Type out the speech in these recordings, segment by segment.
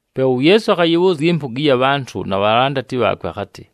Pe uYeesu akhayɨbhʉʉzya ɨmpʉga ɨya bhantʉ na bhalandati bhaakwe akhatɨ,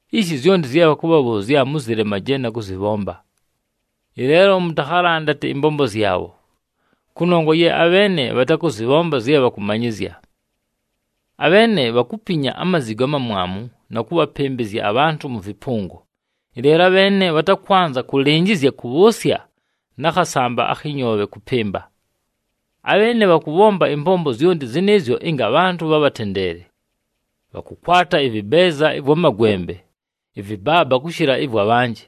Ishi zyonti zye bhakʉbhabhʉʉzya mʉzɨlemaje na kʉzɨbhomba. Ɨleelo mʉtakhalandate ɨmbombo zyabho, kʉnongwa ye abheene bhatakʉzɨbhomba zye bhakʉmanyɨzya. Abheene bhakupinya amazigo amamwamu na kʉbhapɨmbɨzya abhantʉ mʉ vɨpʉngo, ɨleelo abheene bhatakwanza kʉlɨnjɨzya kʉbhʉʉsya na khasamba akhɨ nyoobhe kʉpɨmba. Abheene bhakʉbhomba ɨmbombo zyonti zɨnɨɨzyo ɨnga abhantʉ bhabhatendeele. Bhakʉkwata ɨvɨbeeza ɨvwa magwembe ɨvɨbaaba kʉshɨla ɨvwa bhanjɨ,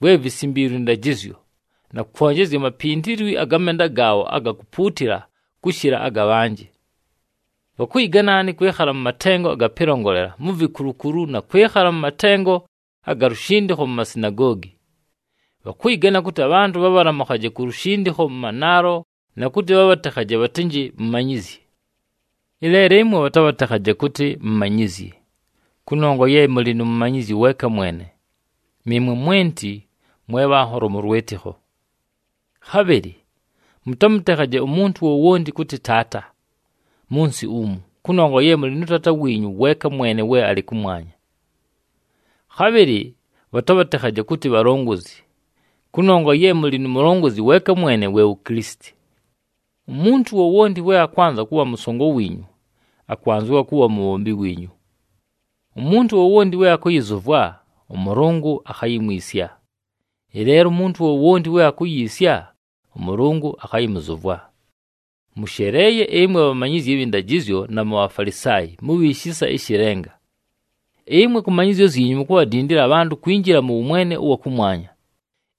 vwe visimbiilwe ɨndajɨzyo, na kwonjezya amapintilwi aga menda gaabho aga kupuutila kʉshɨla aga bhanjɨ. Bhakʉyɨgana nhaani kwɨkhala mʉ matengo aga pɨlongolela mu vikulukulu na kwɨkhala mʉ matengo aga lushindikho mu masinagoogi. Bhakʉyɨgana kʉtɨ abhantʉ bhabhalamʉkhaje ku lushindikho mʉ manaalo na kʉtɨ bhabhatekhaje bhatɨnjɨ, ‘Mumanyizyi.’ “Ɨleelo ɨmwe bhatabhatekhaje kʉtɨ, ‘Mumanyizyi!’ Kʉnongwa ye mʉlɨ nu Mumanyizyi weeka mwene, nɨɨmwe mwenti mwe bhanholo mʉ lwɨtɨkho. Khabhɨlɨ mʉtamʉtekhaje umuntu wowonti kʉtɨ, ‘Taata’ mʉ nsɨ umu, kʉnongwa ye mʉlɨ nʉ Taata wiinyu weeka mwene we alɨ kʉmwanya. Khabhɨlɨ bhatabhatekhaje kʉtɨ, ‘Bhalongozi,’ kʉnongwa ye mʉlɨ nu Mulongozi weeka mwene, we wu Kilisiti. Umuntu wowonti we akwanza kʉbha mʉsongo wiinyu, akwanzɨwa kʉbha mubhombi wiinyu. Umuntu wowonti we akʉyɨzʉvwa, ʉMʉlʉngʉ akhayimwisya. Ɨleelo umuntu wowonti we akuyiisya, ʉMʉlʉngʉ akhayɨmʉzʉvwa. “Mʉsheleeye ɨmwe bhamanyizyi abhɨ ndajɨzyo na muBhafalisaayi, mubhi shisa ɨshɨ lenga! Ɨmwe kʉ manyɨzyo zyinyu mukubhadindila abhantʉ kwinjila mʉ wʉmwene ʉwa kʉmwanya,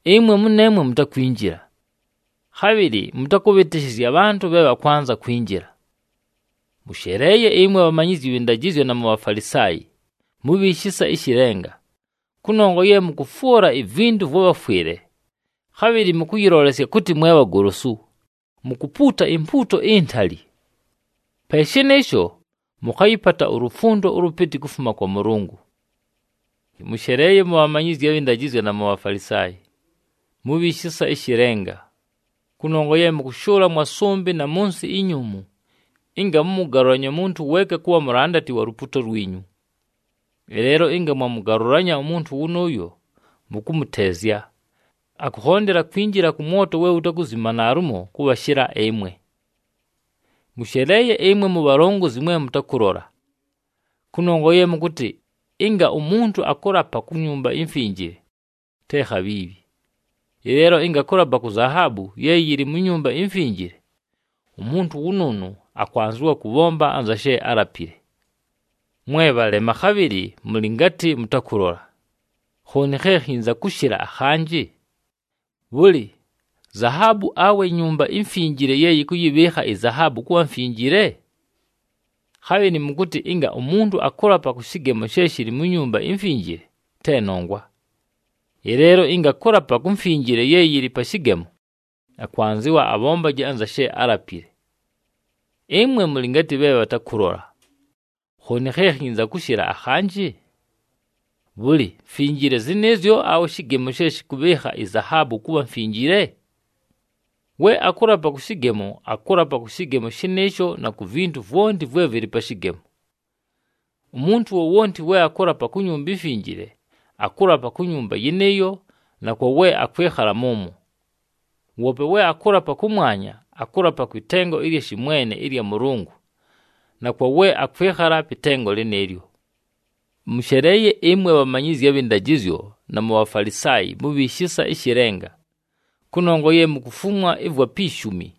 ɨmwe mʉneemwe mutakwinjila. Khabhɨlɨ mʉtakʉbhɨtɨshɨzya abhantʉ bhe bhakwanza kwinjila. [ “Mʉsheleeye ɨmwe bhamanyizyi bhɨ ndajɨzyo na muBhafalisaayi, mubhi shisa ɨshɨ lenga! Kʉnongwa ye mʉkʉfwʉla ivintu vwa bhafwɨle. Khabhɨlɨ mʉkʉyɨlolesya kʉtɨ mwe bhagolosu, mukupuuta impuuto intali. Pe shɨnɨɨsho, mʉkhayɨpata ulufundo ʉlʉpɨtɨ kufuma kwa Mʉlʉngʉ.] “Mʉsheleeye mubhamanyizyi abhɨ ndajɨzyo na muBhafalisaayi, mubhi shisa ɨshɨ lenga! Kʉnongwa ye mʉkʉshʉʉla mwa sʉmbɨ na mʉ nsɨ inyuumu ɨnga mʉmʉgalʉlanye umuntu weeka kʉbha mulandati wa lupuuto lwinyu. Ɨleelo ɨnga mwamʉgalʉlanya umuntu wʉnʉʉyo, mʉkʉmʉteezya, akʉkhondela kwinjila kʉ mwoto we wutakuzima naalumo kʉbhashɨla ɨmwe. “Mʉsheleeye ɨmwe mubhalongozi mwe mʉtakʉlola! Kʉnongwa ye mʉkʉtɨ, ‘Ɨnga umuntu akʉlapa ku Nyumba iMfinjile, te khabhiibhi. Ɨleelo ɨnga akʉlapa ku zahaabu ye yɨlɨ mu Nyumba iMfinjile, umuntu wʉnʉʉnʉ akwanzɨwa kʉbhomba anza she álapile.’ Mwe bhalema, khabhɨlɨ mʉlɨ ngatɨ mʉtakʉlola! Khooni khe khinza kʉshɨla akhanjɨ? Bhʉlɨ, zahaabu, awe iNyumba iMfinjile ye yɨkʉyɨbhɨɨkha izahaabu kʉbha mfinjile? Khabhɨlɨ mʉkʉtɨ, ‘Ɨnga umuntu akʉlapa kʉ shɨgemo she shɨlɨ mu Nyumba iMfinjile, te nongwa. Ɨleelo ɨnga akʉlapa ku mfinjile ye yɨlɨ pa shɨgemo, akwanzɨwa abhombaje anza she álapile.’ Ɨmwe mʉlɨ ngatɨ bhe bhatakʉlola! Khooni khe khinza kʉshɨla akhanjɨ? Bhʉlɨ, mfinjile zɨnɨɨzyo awe shɨgemo she shɨkʉbhɨɨkha izahaabu kʉbha mfinjile? We akʉlapa kʉ shɨgemo, akʉlapa kʉ shɨgemo shɨnɨɨsho na ku vintu vwonti vwe vɨlɨ pa shɨgemo. Umuntu wowonti we akʉlapa ku Nyumba iMfinjile, akʉlapa ku Nyumba yɨnɨɨyo na kwa we akwɨkhala mʉmwo. Woope we akʉlapa kʉmwanya, akʉlapa kwɨ tengo ɨlya shɨmwene ɨlya Mʉlʉngʉ na kwa we akwɨkhala pɨ tengo lɨnɨɨlyo. “Mʉsheleeye ɨmwe bhamanyizyi abhɨ ndajɨzyo na muBhafalisaayi, mubhi shisa ɨshɨ lenga! Kʉnongwa ye mukufumwa ɨvwa pi shumi,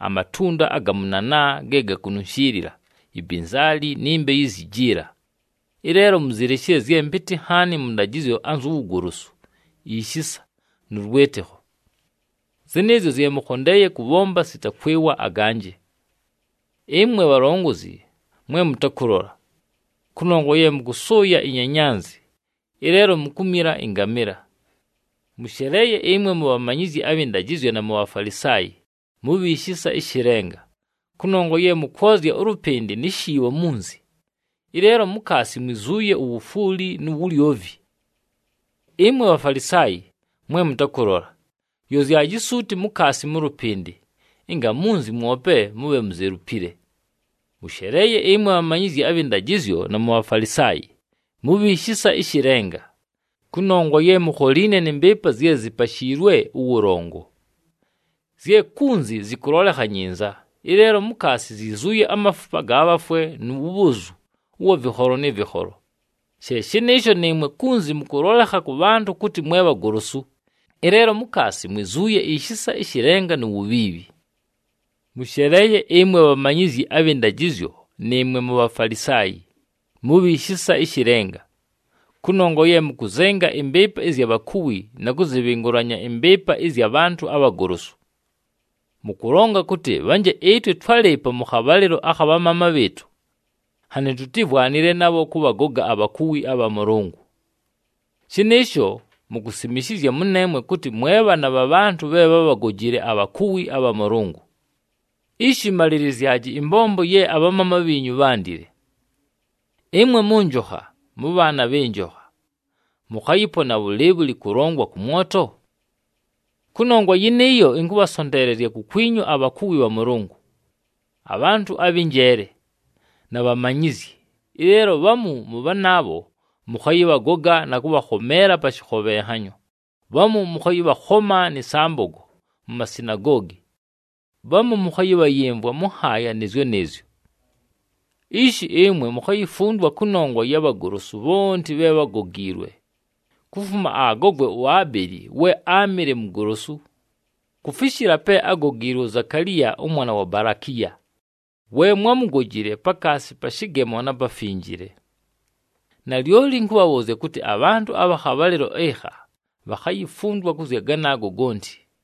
amatʉndʉ aga mʉnanaa ge gakununshiilila, ibinzaali, ni mbeyu izyi jila, ɨleelo muzileshile zye mpɨtɨ nhaani mʉ ndajɨzyo anzu wugolosu, ishisa, nʉ lwɨtɨkho. Zɨnɨɨzyo zye mʉkhondeeye kʉbhomba sita kwɨwa aganjɨ. Ɨmwe bhalongozi mwe mʉtakʉlola! Kʉnongwa ye mʉkʉsʉʉya inyanyanzi, ɨleelo mukumila ɨngamɨla! “Mʉsheleeye ɨmwe mubhamanyizyi abhɨ ndajɨzyo na muBhafalisaayi, mubhi shisa ɨshɨ lenga! Kʉnongwa ye mʉkwozya ʉlʉpɨndɨ ni shiibho munzi, ɨleelo mukaasi mwizuuye uwufwuli nu wulyovi. Ɨmwe Bhafalisaayi, mwe mʉtakʉlola! Yozyaji suuti mukaasi mʉ lʉpɨndɨ, ɨnga munzi mwope mʉbhe muzelupile. “Mʉsheleeye ɨmwe bhamanyizyi abhɨ ndajɨzyo na muBhafalisaayi, mubhi shisa ɨshɨ lenga! Kʉnongwa ye mukholiine nɨ mbɨɨpa zye zipashiilwe ʉwʉlongo, zye kunzi zɨkʉlolekha nyinza, ɨleelo mukaasi zyizuuye amafupa aga bhafwe nu wubhozu ʉwa vɨkholo nɨ vɨkholo. She shɨnɨɨsho, nɨɨmwe kunzi mʉkʉlolekha kʉ bhantʉ kʉtɨ mwe bhagolosu, ɨleelo mukaasi mwizuuye ishisa ɨshɨ lenga nu wubhiibhi. “Mʉsheleeye ɨmwe bhamanyizyi abhɨ ndajɨzyo nɨɨmwe muBhafalisaayi, mubhi shisa ɨshɨ lenga! Kʉnongwa ye mʉkʉzenga ɨmbɨɨpa ɨzya bhakuwi na kʉzɨbhɨngʉlanya ɨmbɨɨpa ɨzya bhantʉ abhagolosu. Mʉkʉlonga kʉtɨ, ‘Bhanje ɨtwe twálɨɨpo mʉ khabhalɨlo akha bhamaama bhɨɨtʉ, nhanɨ tutímvwanile nabho kʉbhagoga abhakuwi abha Mʉlʉngʉ.’ Shɨnɨɨsho, mukusimishizya mʉneemwe kʉtɨ mwe bhaana bha bhantʉ bhe bhábhagojile abhakuwi abha Mʉlʉngʉ! Ishi malilizyaji ɨmbombo ye abhamaama bhiinyu bhándile! “Ɨmwe mʉnjokha, mʉbhaana bhɨ njokha! Mʉkhayɨpona bhʉlɨɨbhʉlɨ kʉlongwa kʉ mwoto? Kʉnongwa yɨnɨɨyo, ɨnkʉbhasonteelezya kukwinyu abhakuwi bha Mʉlʉngʉ, abhantʉ abhɨ njeele, na bhamanyizyi. Ɨleelo bhamu mʉ bhanaabho, mʉkhayɨbhagoga na kʉbhakhomeela pa shɨkhobhenhanyo, bhamu mʉkhayɨbhakhoma nɨ sambogo mu masinagoogi, bhamu mʉkhayɨbhayɨmvwa mʉ nhaaya nɨɨzyo nɨɨzyo. Ishi, ɨmwe mukhayifundwa kʉnongwa ya bhagolosu bhonti bhe bhágogiilwe, kufuma agogwe uAbeli we áamɨle mugolosu, kufishila pe ágogiilwe uZakaliya ʉmwana wa Balakiya, we mwámugojile pakaasi pa shɨgemo na Pafinjile. Nalyoli ɨnkʉbhabhʉʉzya kʉtɨ, abhantʉ abha khabhalɨlo ɨkha bhakhayifundwa kʉ zya ganaago gonti.”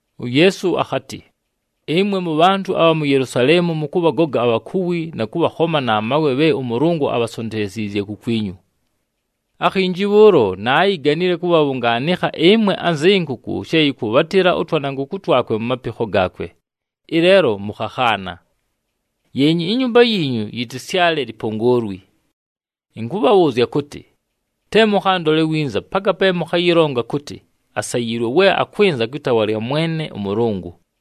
UYeesu akhatɨ, “Ɨmwe mʉbhantʉ abha mu Yelusaleemu, mʉkʉbhagoga abhakuwi na kʉbhakhoma na mawe bhe ʉMʉlʉngʉ abhasonteleziizye kukwinyu. Akhinji bhʉʉlo, naayiganile kʉbhabhʉngaanɨkha ɨmwe anzɨ nkʉkʉ she yɨkwʉbhatɨla ʉtwanankʉkʉ twakwe mu mapikho gaakwe, ɨleelo mʉkhakhaana! Yeenya, inyumba yiinyu yɨtɨsyale lipongoolwi! Ɨnkʉbhabhʉʉzya kʉtɨ, te mʉkhandole winza paka pe mʉkhayɨlonga kʉtɨ, ‘Asayiilwe we akwɨnza kwɨ taawa lya Mwene ʉMʉlʉngʉ!’”